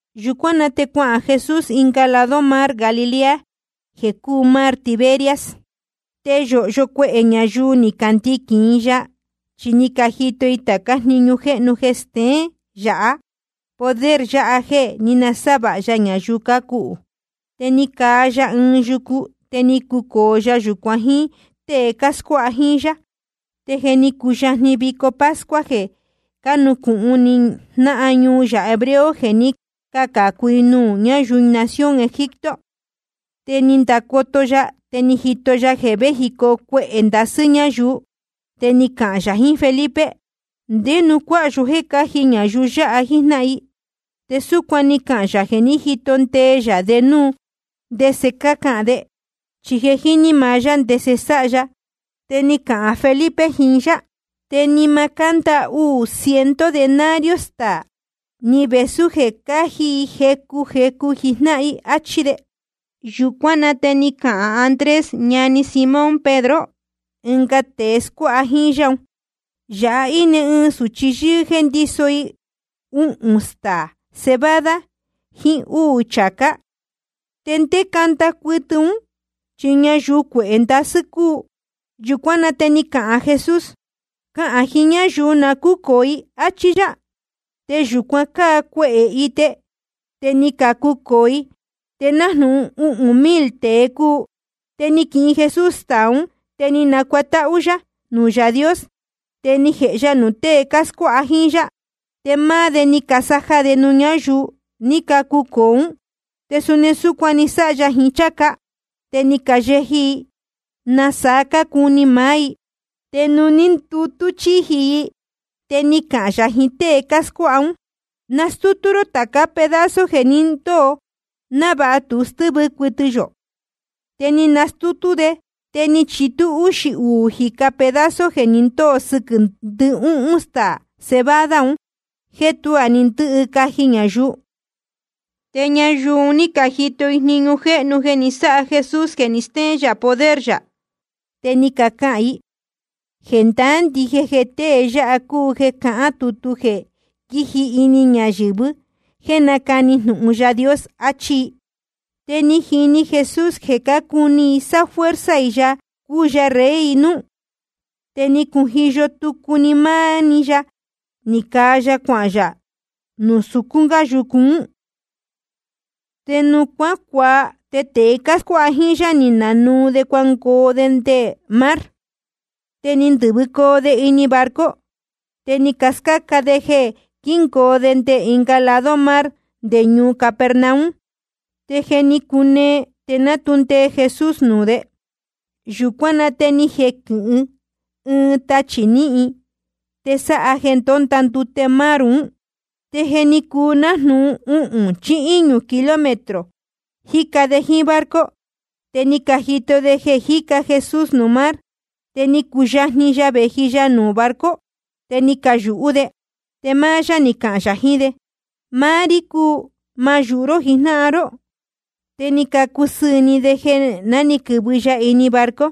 Yūcuán na te cuahān Jesús ɨnga lado mar Galilea, jeē cúu mar Tiberias. Te yōhyo cuehē ñayuu ni candiquīn i ya, chi ni cajito i tācá jniñu jéhnu jeē steén yā poder yā jeē ní nasávāha ya ñayuu cácuhū. Te ni caa ya ɨɨn yucu, te ni cucōo ya yūcuan jíín tée cáscuáha jíín yá. Te je ni cuyajni vico pascua jeē cánucūhun ni jnáhan ñuu yā hebreo jeē ní cacācu i nuū ñáyuu nación Egipto. Te ni ndacoto ya, te ni jito ya jeē véjicoo cuehē ndasɨ́ ñáyuu. Te ni cahān yā jiín Felipe: ¿Ndé nuū cuaan yó jéē cáji ñayuu yáha jíjnáhan i? Te súcuan ni cahān yā jeē jíto ndee yā de núu ndese cahān de. Chi je jíní maá yá ndese sáha ya. Te ni cahān Felipe jiín yá: Te ni ma cánda uū ciento denario staā, ni vēsú jeē cáji i jecu jecu jijnáhan i, áchí de. Yūcuán na te ni cahān Andrés, ñani Simón Pedro, ɨnga tēe scuáha jíín yá un: Yāha íne ɨɨn sūchi yɨ́ɨ́ jéē ndíso i uhūn staā cebada jiín úū chācá. ¿Te ndé canda cuɨtɨ ún, chi ñayuu cuehē ndasɨ́ cúu? Yūcuán na te ni cahān Jesús: Cahān jiín ñáyuu na cúcōo i, áchí yá. Te yūcuan cáa cuehē ite, te ni cacucōo i, te nájnūhun uhūn mil tēe cúu. Te ni quihin Jesús staā ún, te ni nacuatáhú yá nuū Yaā Dios. Te ni jēhe ya nuū tée cáscuáha jíín yá, te máá de ni casaja de nuū ñáyuu ní cacucōo ún. Te suni súcuan ni sáha ya jiín cháca, te ni cayeji i nasaa cácuni maá i. Te nuū ní candutú chíji i, te ni cahān yā jiín tée cáscuáha ún: Nastútú ró tācá pedazo jeē ni ndóo, návāha tu stɨ́vɨ cuɨtɨ yō. Te ni canastútú de, te ni chitú úxī uū jīca pedazo jeē ni ndóo sɨquɨ̄ ndɨhúhún staā cebada un jeē tuá ni ndɨ́hɨ caji ñayuu. Te ñayuu un ní cajito i jniñu jéhnu ni sáha Jesús jeē ni stéén yā poder yā. Te ni cacahān i: Jendaá ndije jeē tée yáha cúu jeē cahán tutu jeē quíji ini ñayɨ̄vɨ jéē nácani jnūhun Yaā Dios. Achí i. Te ni jini Jesús jeē cácuni i sáfuerza i ya jeē cuu ya rey i núú. Te ni cujiyo tucu máá ɨɨn‑ni ya, ni caa ya cuahān yā nuū sucún gá yucu. Te nuū cuácuaa, te tēe cáscuáha jíín yá ni nanuu de cuangoo de nde mar. Te ni ndɨ̄vɨcoo de ini barco, te ni cascáca de jeē quíngoo de nde ɨnga lado mar nde ñuu Capernaum. Te je ni cunee, te ná tu ndee Jesús nuū de. Yūcuán na te ni jequɨ̄hɨ ɨɨn tachī níhin, te sáha jeē ndónda ndute mar un. Te jeē ní cuu nájnūhun uhūn chí íñū kilómetro cájica de jíín barco, te ni cajito de jeē jíca Jesús nuū mar, te ni cuyajni ya vēji ya nuū barco. Te ni cayūhú de. Te máá yá ni cahān yā jiín de: Máá rí cúu. Ma yūhu ró jijnáhan ró. Te ni cacusɨɨ̄ ni de jeē na quɨ́vɨ ya ini barco.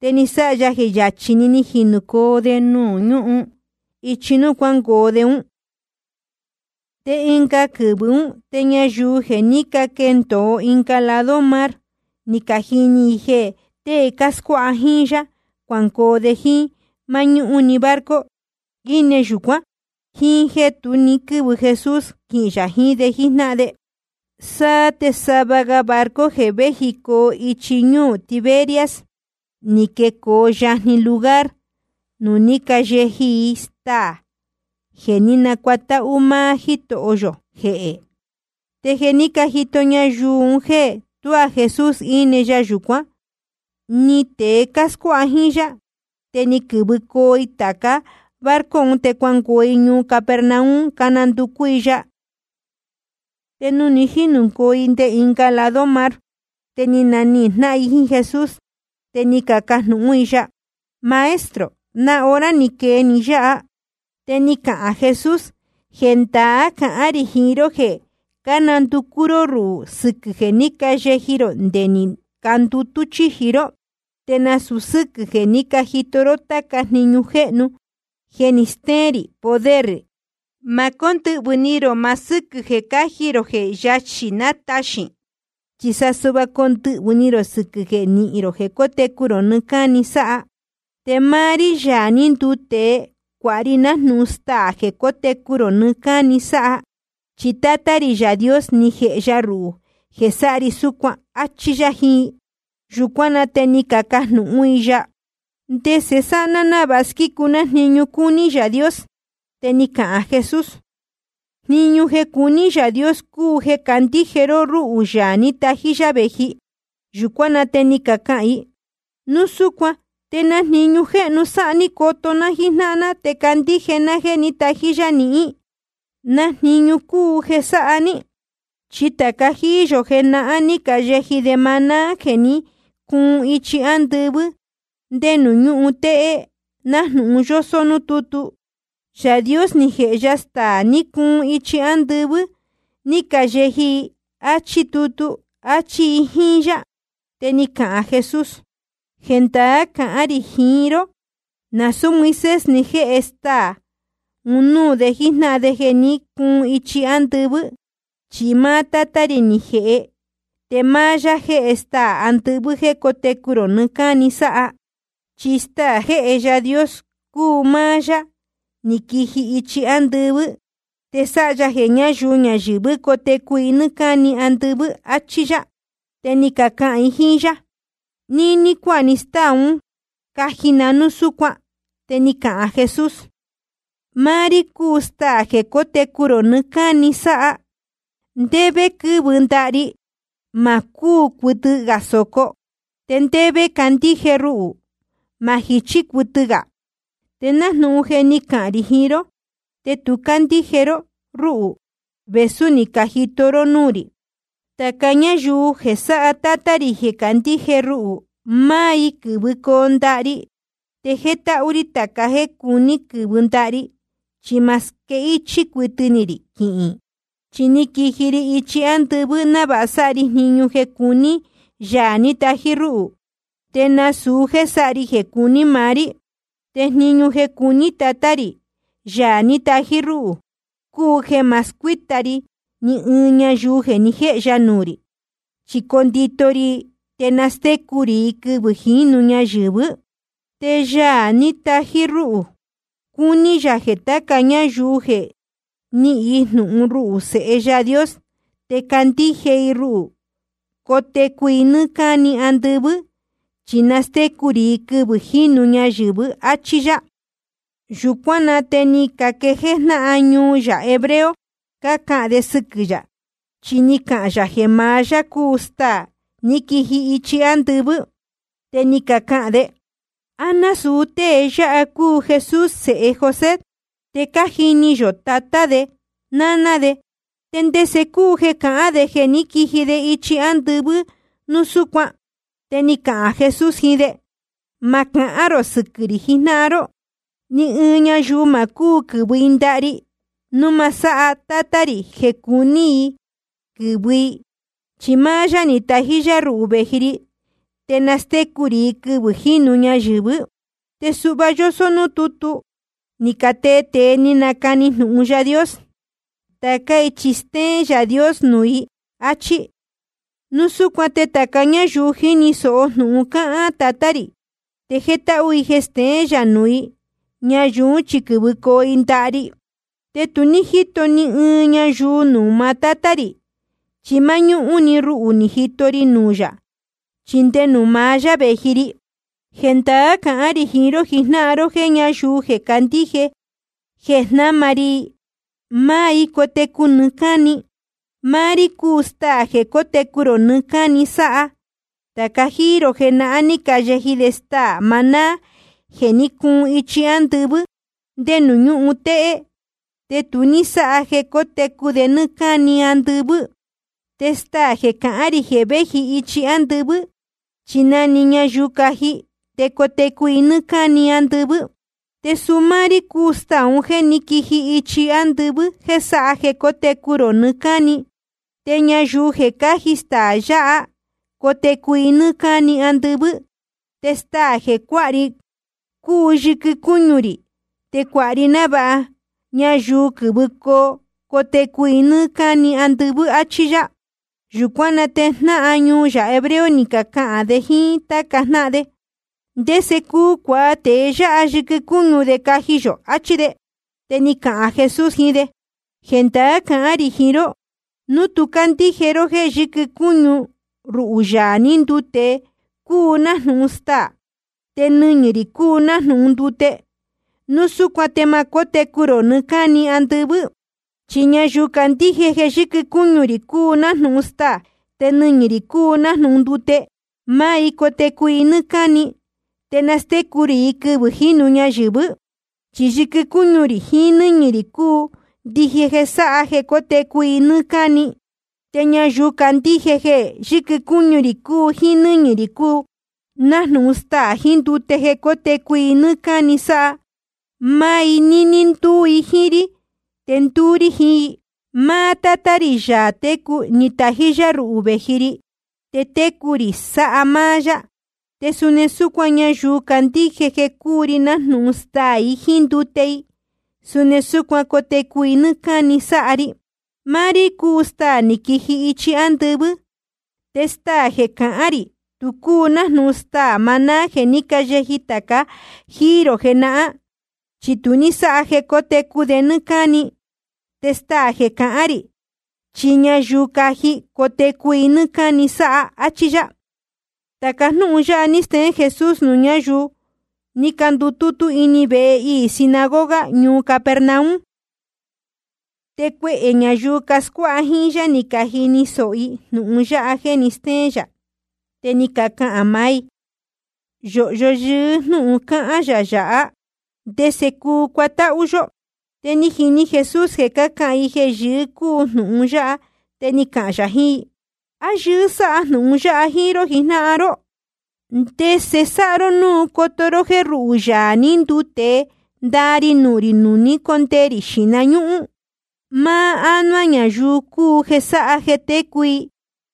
Te ni sáha ya jeē yachī‑ni ni jinūcoo‑ni de ñuhun íchi núū cuángoo de ún. Te ɨnga quɨvɨ̄ ún, te ñayuu jeē ní caquendōo ɨnga lado mar, ni cajini i jeē tée cáscuáha jíín yá cuangoo de jíín máñúhún‑ni barco ni íne yūcuán, jíín jéē tu ní quɨ́vɨ Jesús quihīn yā jiín de jíjnáhan de. Te sava ga barco jeē véjicoo ichi ñúū Tiberias, ni quecoo yajni lugar nuū ní cayeji i staā jeē ní nacuatáhú máá Jítoho yō jehē. Te jeē ní cajito ñayuu un jéē tuá Jesús íne ya yūcuán, ni tēe cáscuáha jíín yá, te ni quɨ̄vɨcoo i tāca barco un, te cuangoo i ñuu Capernaum cuananducú i ya. Te nuū ni jínūcoo i nde ɨnga lado mar, te ni nanihīn jnáhan i jíín Jesús. Te ni cacajnūhún i ya: Maestro, ¿na hora ni quee ni yáha? Te ni cahān Jesús: Jendaá cahán rī jiín ró jeē cánanducú ró ruhū sɨquɨ̄ jeē ní cayeji rō nde ni candutú chíji ró, te nasūu sɨ́quɨ̄ jeē ní cajito ró táca jniñu jéhnu jeē steén rī poder rī. Ma cóndɨhvɨ̄ ni rō maá sɨ́quɨ̄ jeē caji rō jeē yachī nataxīn, chi sa suhva condɨhvɨ̄ ni rō sɨquɨ̄ jeē nihín rō jeē cótecu rō nɨɨ́ cáni sáha. Te máá rí, Yaā ní nduu tēe, cuāha ri nájnūhun staā jeē cótecu rō nɨɨ́ cáni sáha. Chi Tátá rī Yaā Dios ni jeni ya ruhū jeē sáha ri súcuan. Achí yá jiín i. Yūcuán na te ni cacajnūhún i ya: ¿Ndese sáha ná návāha squícu ná jniñu cúní Yaā Dios? Te ni cahān Jesús: Jniñu jeē cuní Yaā Dios cúu jeē candíje ró rúhū, Yaā ní tají yá vēji. Yūcuán na te ni cacahān i: Núu súcuan ¿te na jniñu jéhnu sáha ní coto ná jíjnáhan ná te candíje ná jéē ní tají yá nihín? ¿Na jniñu cúu jeē sáha ní? Chi tāca jíí yō jenahán ni cayeji de maná jeē ní cuun ichi ándɨvɨ́ ndé nuū ñúhun téhé, nájnūhun yósó núū tútu: Yaā Dios ni jēhe ya staā ni cuun ichi ándɨvɨ́, ni cayeji i, áchí tutu. Achí i jíín yá. Te ni cahān Jesús: Jendaá cahán rī jiín ró: Nasūú Moisés ni jéhe staā un núū de jíjnáhan de jeē ní cuun ichi ándɨvɨ́, chi máá Tátá rī ni jēhe. Te máá yá jéhe staā andɨvɨ́ jéē cótecu rō nɨɨ́ cáni sáha. Chi staā jéhe Yaā Dios cúu máá Yaā ní quiji ichi ándɨvɨ́, te sáha ya jeē ñáyuu ñayɨ̄vɨ́ cotecu i nɨ́ɨ́ cáni andɨvɨ́. Achí yá. Te ni cacahān i jíín yá: Níní cuáha ni stáā ún caji na núu súcuan. Te ni cahān Jesús: Máá rí cúu máá stáā jeē cótecu rō nɨɨ́ cáni sáha. Ndé vé quɨ́vɨ ndaha ri, ma cúū cuɨtɨ gā sōco. Te ndé vé candíje ruhū, ma jichí cuɨtɨ gā. Te nájnūhun je ni cahān rī jiín ró, tu cácandíje ró rúhū, vēsú ni cajito ró núū rī. Tāca ñáyuu jeē sáha Tátá rī jeē candíje i ruhū, máá i quɨ́vɨcoo ndaha ri. Te jétáhú rí tāca jéē cuní quɨ̄vɨ ndaha ri, chi ma squéhichī cuɨtɨ rī quihīn. Chi ni quiji ri ichi ándɨvɨ́ návāha sáha ri jniñu jeē cuní Yaā ní tají rúhū, te nasūu jéē sáha ri jeē cuní maá rí. Te jniñu jeē cuní Tatá rī, Yaā ní tají rúhū, cúu jeē ma scuíta ri ni ɨɨn ñayuu ni jéhe ya nuū rī, chi condito ri i te nastécu rī i quɨvɨ̄ jínu ñayɨ̄vɨ́. Te Yaā ní tají rúhū, cuní yā jeē tāca ñáyuu jeē nihín i jnūhun ruhū, Sēhe Yaā Dios, te candíje i ruhū, cotecu i nɨ́ɨ́ cáni andɨvɨ́. Chi nastécu rī i quɨvɨ̄ jínu ñayɨ̄vɨ́. Achí yá. Yūcuán na te ni caquejéé jnáhan ñuu yā hebreo cácahān de sɨquɨ̄ yā, chi ni cahān yā jeē maá yá cúu staā ní quiji ichi ándɨvɨ́. Te ni cacahān de: ¿A násūu tée yáha cúu Jesús, sēhe José? Te cájini yō tatá de náná de. ¿Te ndese cúu jeē cahán de jeē ni quíji de ichi ándɨvɨ́ núu súcuan? Te ni cahān Jesús jiín de: Ma cahán rō sɨquɨ̄ rī jijnáhan ró. Ni ɨɨn ñayuu ma cúu quɨ̄vɨ i ndaha ri núu ma sáha Tátá rī jeē cúu ni i quɨ̄vɨ i, chi máá yá ni tají rúhū vēji ri. Te nastécu rī i quɨvɨ̄ jínu ñayɨ̄vɨ́. Te suhva yósó núū tútu ni catee tēe ni canacani jnūhun Yaā Dios: Tācá i chi stéén Yaā Dios nuū i, áchí. Núu súcuan te tāca ñáyuu jíni sōho jnūhun cáhán Tatá rī, te jétáhú i jeē steén yā nuū i, ñayuu ún chi quɨ́vɨcoo i ndaha ri. ’Te tu ní jíto ni ɨɨn ñayuu nuū maá Tátá rī. Chi máñúhún‑ni ruhū ni jito ri nuū yā, chi nde nuū maá yá vēji ri. Jendaá cahán rī jiín ró jijnáhan ró jéē ñayuu jeē candíje i jeē jnáma ri i, máá i cotecu i nɨ́ɨ́ cáni. Máá rí cúu staā jeē cótecu rō nɨɨ́ cáni sáha. Tāca jíí rō jenahán, ni cayeji de staā maná jeē ní cuun ichi ándɨvɨ́ ndé nuū ñúhun téhé, te tu ní sáha jeē cótecu de nɨ́ɨ́ cáni andɨvɨ́. Te staā jeē cahán rī jeē véji ichi ándɨvɨ́, chi na‑ni ñayuu caji, te cotecu i nɨ́ɨ́ cáni andɨvɨ́. Te suu máá rí cúu staā un jéē ní quiji ichi ándɨvɨ́ jéē sáha jeē cótecu rō nɨɨ́ cáni. Te ñayuu jeē cáji staā yáha, cotecu i nɨ́ɨ́ cáni andɨvɨ́. Te staā jeē cuáha ri un cúu yɨquɨ cúñu rī, te cuāha ri návāha ñayuu ñayɨ̄vɨ́ cotecu i nɨ́ɨ́ cáni andɨvɨ́. Achí yá. Yūcuán na te jnáhan ñuu yā hebreo ni cacahān de jíín táca jnáhan de: ¿Ndese cuu cuāha tēe yáha yɨquɨ cúñu de caji yō? achí de. Te ni cahān Jesús jiín de: Jendaá cahán rī jiín ró: Núu tú candíje ró jéē yɨquɨ cúñu ruhū, Yaā ní nduu tēe, cúu nájnūhun staā, te nɨñɨ̄ rī cúu nájnūhun ndute, núu súcuan te ma cótecu rō nɨɨ́ cáni andɨvɨ́. Chi ñayuu cácandíje jeē yɨquɨ cúñu rī cúu nájnūhun staā te nɨñɨ̄ rī cúu nájnūhun ndute, máá i cotecu i nɨ́ɨ́ cáni. Te nastécu rī i quɨvɨ̄ jínu ñayɨ̄vɨ́. Chi yɨquɨ cúñu rī jiín nɨ́ñɨ̄ rī cúu ndije jeē sáha jeē cótecu i nɨ́ɨ́ cáni. Te ñayuu cácandíje jeē yɨquɨ cúñu rī jiín nɨ́ñɨ̄ rī cúu nájnūhun staā jiín ndute jeē cótecu i nɨ́ɨ́ cáni sáha, máá i níní ndúú i jíín rí, te ndúú rí jiín i. Máá Tátá rī, Yaā técu, ni tají yá ruhū vēji ri, te técu rī sáha máá yá. Te suni súcuan, ñayuu cácandíje jeē cúu ri nájnūhun staā i ndute i, suni súcuan cotecu i nɨ́ɨ́ cáni sáha ri. Máá rí cúu staā ní quiji ichi ándɨvɨ́. Te staā jeē cahán rī tu cúu nájnūhun staā maná jeē ní cayeji tāca jíí rō jenahán, chi tu ní sáha jeē cótecu de nɨ́ɨ́ cáni. Te staā jeē cahán rī, chi ñayuu caji, cotecu i nɨ́ɨ́ cáni sáha, áchí yá. Tāca jnúhun yáha ní steén Jesús nuū ñáyuu ní candutútú ini vehe iī sinagoga ñuu Capernaum. Te cuehē ñayuu cascuáha jíín yá, ni cajini sōho i jnūhun yáha jéē ni stéén yā. Te ni cacahān maá i: Yōhyo yɨɨ́ jnúhun cáhán yā yāhá. ¿Ndese cuu cuatáhú yó? Te ni jini Jesús jeē cácahān i jeē yɨɨ́ cúu jnūhun yāhá, te ni cahān yā jiín i: ¿A yɨɨ́ sáha jnūhun yáha jíín ró jijnáhan ró? ¿Te ndese sáha ró núu coto ró jéē ruhū, Yaā ní nduu tēe, ndaa ri nuhun rī nuū ni cóndee rī xīhna ñúhún? Máá ánuá ñayuu cúu jeē sáha jeē técu i.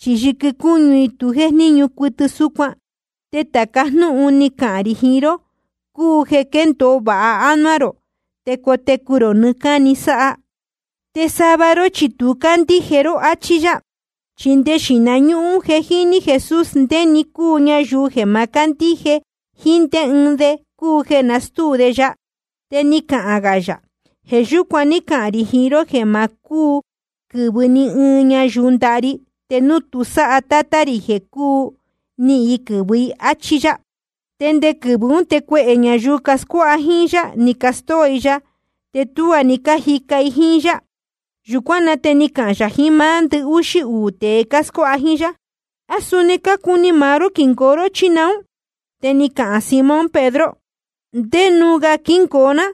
Chi yɨquɨ cúñu i tu jéjníñu cuɨtɨ súcuan. Te tāca jnúhun ni cahān rī jiín ró cúu jeē quéndōo vāha ánuá rō, te cotecu rō nɨɨ́ cáni sáha. Te sava ró chi tu cácandíje ró. Achí yá. Chi nde xīhna ñúhún je jíní Jesús ndé‑ni cúu ñayuu jeē ma cándíje, jíín ndé ɨɨn de cúu jeē nastúu de ya. Te ni cahān gā yā: Jeē yúcuan ní cahān rī jiín ró jeē ma cúu quɨ̄vɨ ni ɨɨn ñayuu ndaha ri, te núu tu sáha Tátá rī jeē cúu ni i quɨ̄vɨ i, áchí yá. Te nde quɨvɨ̄ ún te cuehē ñayuu cascuáha jíín yá, ni castóo i ya, te tuá ni cájica i jíín yá. Yūcuán na te ni cahān yā jiín máá ndɨhúxí uū tēe cáscuáha jíín yá: ¿A suni cácuni máá ró quingoo ró, chí naún? Te ni cahān Simón Pedro: ¿Ndé núū gā quingoo ná?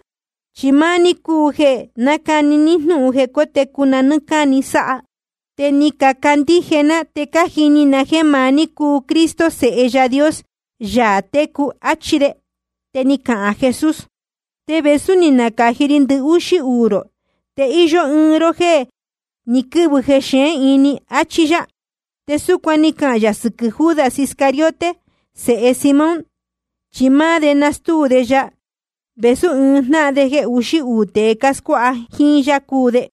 Chi máá ní cúu jeē nácani jnūhun jeē cótecu na nɨ́ɨ́ cáni sáha. Te ni cacandíje ná te cájini na jéē maá ní cúu Cristo, Sēhe Yaā Dios, Yaā técu, achí de. Te ni cahān Jesús: Te vēsú ni nacāji ri ndɨhúxí uū rō, te íyó ɨɨn ró jeē ní quɨ̄vɨ jexeén ini. Achí yá. Te súcuan ni cahān yā sɨquɨ̄ Judas Iscariote, sēhe Simón. Chi máá de nastúu de ya, vēsú ɨɨn jnáhan jeē uxí uū tēe cáscuáha jíín yá cúu de.